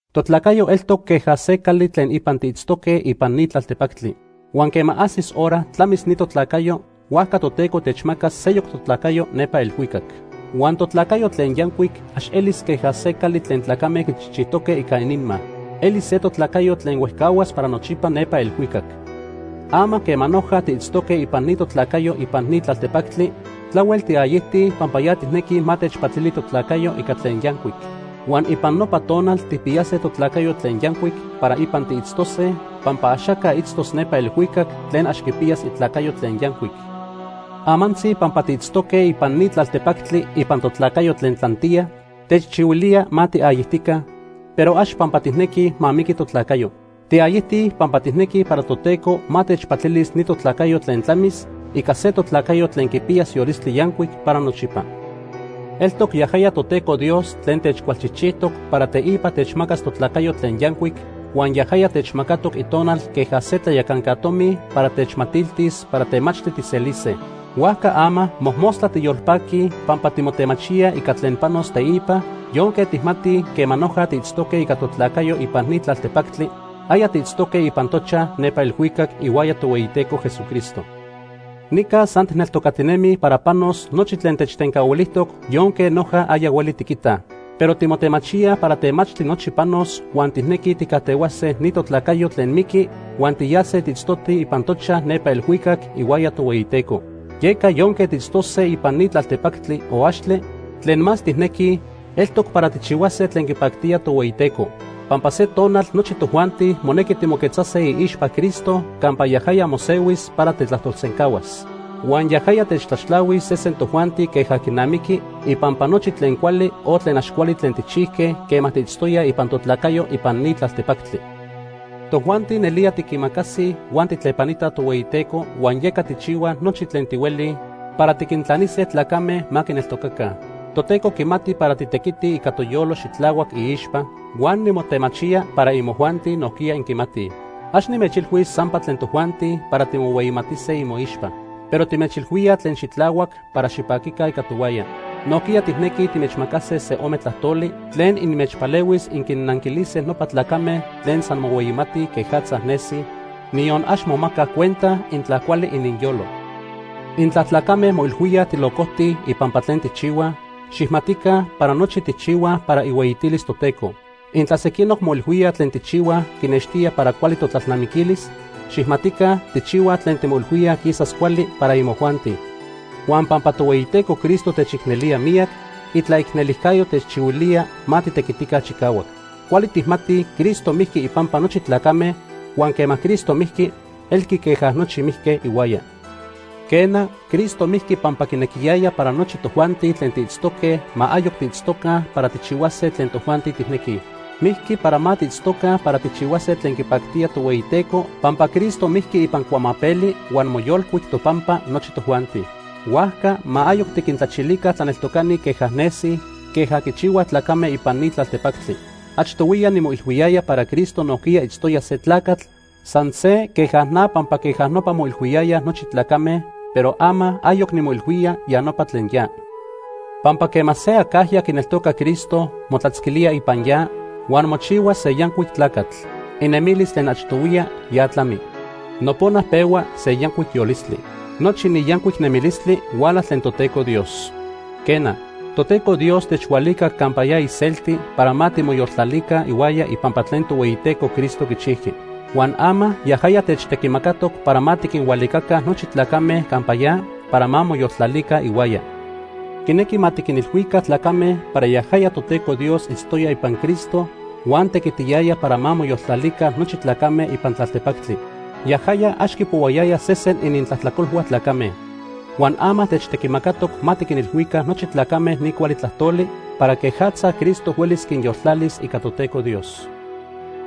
Totlacayo eltoc queja se cali tlen ipan tiitztoque ipan ni tlaltepactli. Huan quema ajsis hora tlamis ni totlacayo, huajca Toteco techmacas seyoc totlacayo nepa elhuicac. Huan totlacayo tlen yancuic ax elis queja se cali tlen tlacame quichijchijtoque ica ininma. Elis se totlacayo tlen huejcahuas para nochipa nepa elhuicac. Ama quema noja tiitztoque ipan ni totlacayo ipan ni tlaltepactli, tlahuel tiayijtij pampa ya tijnequij ma techpatili totlacayo ica tlen yancuic. Huan ipan nopa tonal tijpiyase totlacayo tlen yancuic para ipan tiitztose, pampa axaca itztos nepa elhuicac tlen ax quipiyas itlacayo tlen yancuic. Amantzi pampa tiitztoque ipan ni tlaltepactli ipan totlacayo tlen tlantiya, techchihuilía ma tiayijtica, pero ax pampa tijnequij ma miqui totlacayo. Tiayijtij pampa tijnequij para Toteco ma techpatilis ni totlacayo tlen tlamis ica se totlacayo tlen quipiyas yolistli yancuic para nochipa. Eltoc yajaya Toteco Dios tlen techcualchijchijtoc para teipa techmacas totlacayo tlen yancuic, huan yajaya techmacatoc Itonal queja se tlayacanca tomi para techmatiltis para temachtli tijselise. Huajca ama mojmostla tiyolpaquij pampa timotemachíaj ica tlen panos teipa, yonque tijmatij quema noja tiitztoque ica totlacayo ipan ni tlaltepactli, aya tiitztoque ipan tochaj nepa elhuicac ihuaya Tohueyiteco Jesucristo. Nica san tijneltocatinemij para panos nochi tlen techtencahuilijtoc yonque noja aya hueli tiquitaj. Pero timotemachíaj para temachtli nochi panos huan tijnequij tijcajtehuase ni totlacayo tlen miqui huan tiyase tiitztotij ipan tochaj nepa elhuicac ihuaya Tohueyiteco. Yeca yonque tiitztose ipan ni tlaltepactli o axtle, tlen más tijnequij eltoc para tijchihuase tlen quipactía Tohueyiteco, pampa se tonal nochi tojuanti monequi timoquetzase iixpa Cristo campa yajaya mosehuis para techtlajtolsencahuas. Huan yajaya techtlaxtlahuis sesen tojuanti queja quinamiqui ipampa nochi tlen cuali o tlen ax cuali tlen tijchijque quema tiitztoyaj ipan totlacayo ipan ni tlaltepactli. Tojuanti nelía tiquimacasij huan tijtlepanitaj Tohueyiteco, huan yeca tijchihuaj nochi tlen tihuelij para tiquintlanise tlacame ma quineltocaca. Toteco quimati para titequitij ica toyolo xitlahuac iixpa, huan nimotemachía para imojuanti nojquiya inquimatij. Ax nimechilhuis sampa tlen tojuanti para timohueyimatise imoixpa, pero timechilhuíaj tlen xitlahuac para xipaquica ica tohuaya. Nojquiya tijnequij timechmacase se ome tlajtoli tlen inmechpalehuis inquinnanquilise nopa tlacame tlen san mohueyimatij quejatza nesij, niyon ax momacaj cuenta intla cuali ininyolo. Intla tlacame moilhuíaj tilocojtij ipampa tlen tijchihuaj, xijmatica para nochi tijchihuaj para ihueyitilis Toteco. Intla sequinoc moilhuíaj tlen tijchihuaj quinextía para cuali totlalnamiquilis, xijmatica tijchihuaj tlen timoilhuíaj quisas cuali para imojuanti. Huan pampa Tohueyiteco Cristo techicnelía miyac, itlaicnelijcayo techchihuilía ma titequitica chicahuac. Cuali tijmatij Cristo mijqui ipampa nochi tlacame, huan quema Cristo mijqui, elqui queja nochi mijque ihuaya. Quena, Cristo mijqui pampa quinequiyaya para nochi tojuanti tlen tiitztoque ma ayoc tiitztoca para tijchihuase tlen tojuanti tijnequij. Mijqui para ma tiitztoca para tijchihuase tlen quipactía Tohueyiteco pampa Cristo mijqui ipan cuamapeli huan moyolcuic topampa nochi tojuanti. Huajca ma ayoc tiquintlachilica tlaneltocani queja nesij, queja quichihuaj tlacame ipan ni tlaltepactli. Achtohuiya nimoilhuiyaya para Cristo nojquiya itztoya se tlacatl san se queja na pampa queja nopa moilhuiyayaj nochi tlacame, pero ama ayoc nimoilhuía ya nopa tlen ya. Pampa quema se acajya quineltoca Cristo motlatzquilía ipan ya, huan mochihua se yancuic tlacatl. Inemilis tlen achtohuiya ya tlami. Nopona pehua se yancuic yolistli. Nochi ni yancuic nemilistli huala tlen Toteco Dios. Quena, Toteco Dios techhualicac campa ya iselti para ma timoyoltlalica ihuaya ipampa tlen Tohueyiteco Cristo quichijqui. Huan ama yajaya techtequimacatoc para ma tiquinhualicaca nochi tlacame campa ya para ma moyoltlalica ihuaya. Quinequi ma tiquinilhuica tlacame para yajaya Toteco Dios itztoya ipan Cristo huan tequitiyaya para ma moyoltlalica nochi tlacame ipan tlaltepactli. Yajaya ax quipohuayaya sesen inintlajtlacolhua tlacame. Huan ama techtequimacatoc ma tiquinilhuica nochi tlacame ni cuali tlajtoli para quejatza Cristo huelis quinyoltlalis ica Toteco Dios.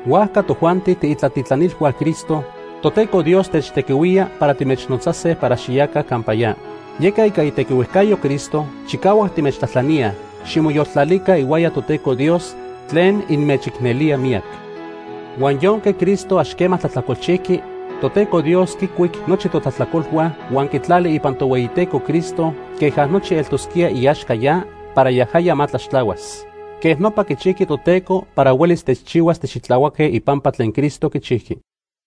Huajca tojuanti tiitlatitlanilhua Cristo, Toteco Dios techtequihuía para timechnotzase para xiyaca campa ya. Yeca ica itequihuejcayo Cristo chicahuac timechtlajtlaníaj, ximoyoltlalica ihuaya Toteco Dios tlen inmechicnelía miyac. Huan yonque Cristo ax quema tlajtlacolchijqui, Toteco Dios quicuic nochi totlajtlacolhua huan quitlali ipan Tohueyiteco Cristo queja nochi eltosquía iaxca ya para yajaya ma tlaxtlahuas. Quej nopa quichijqui Toteco para huelis techchihuas tixitlahuaque ipampa tlen Cristo quichijqui.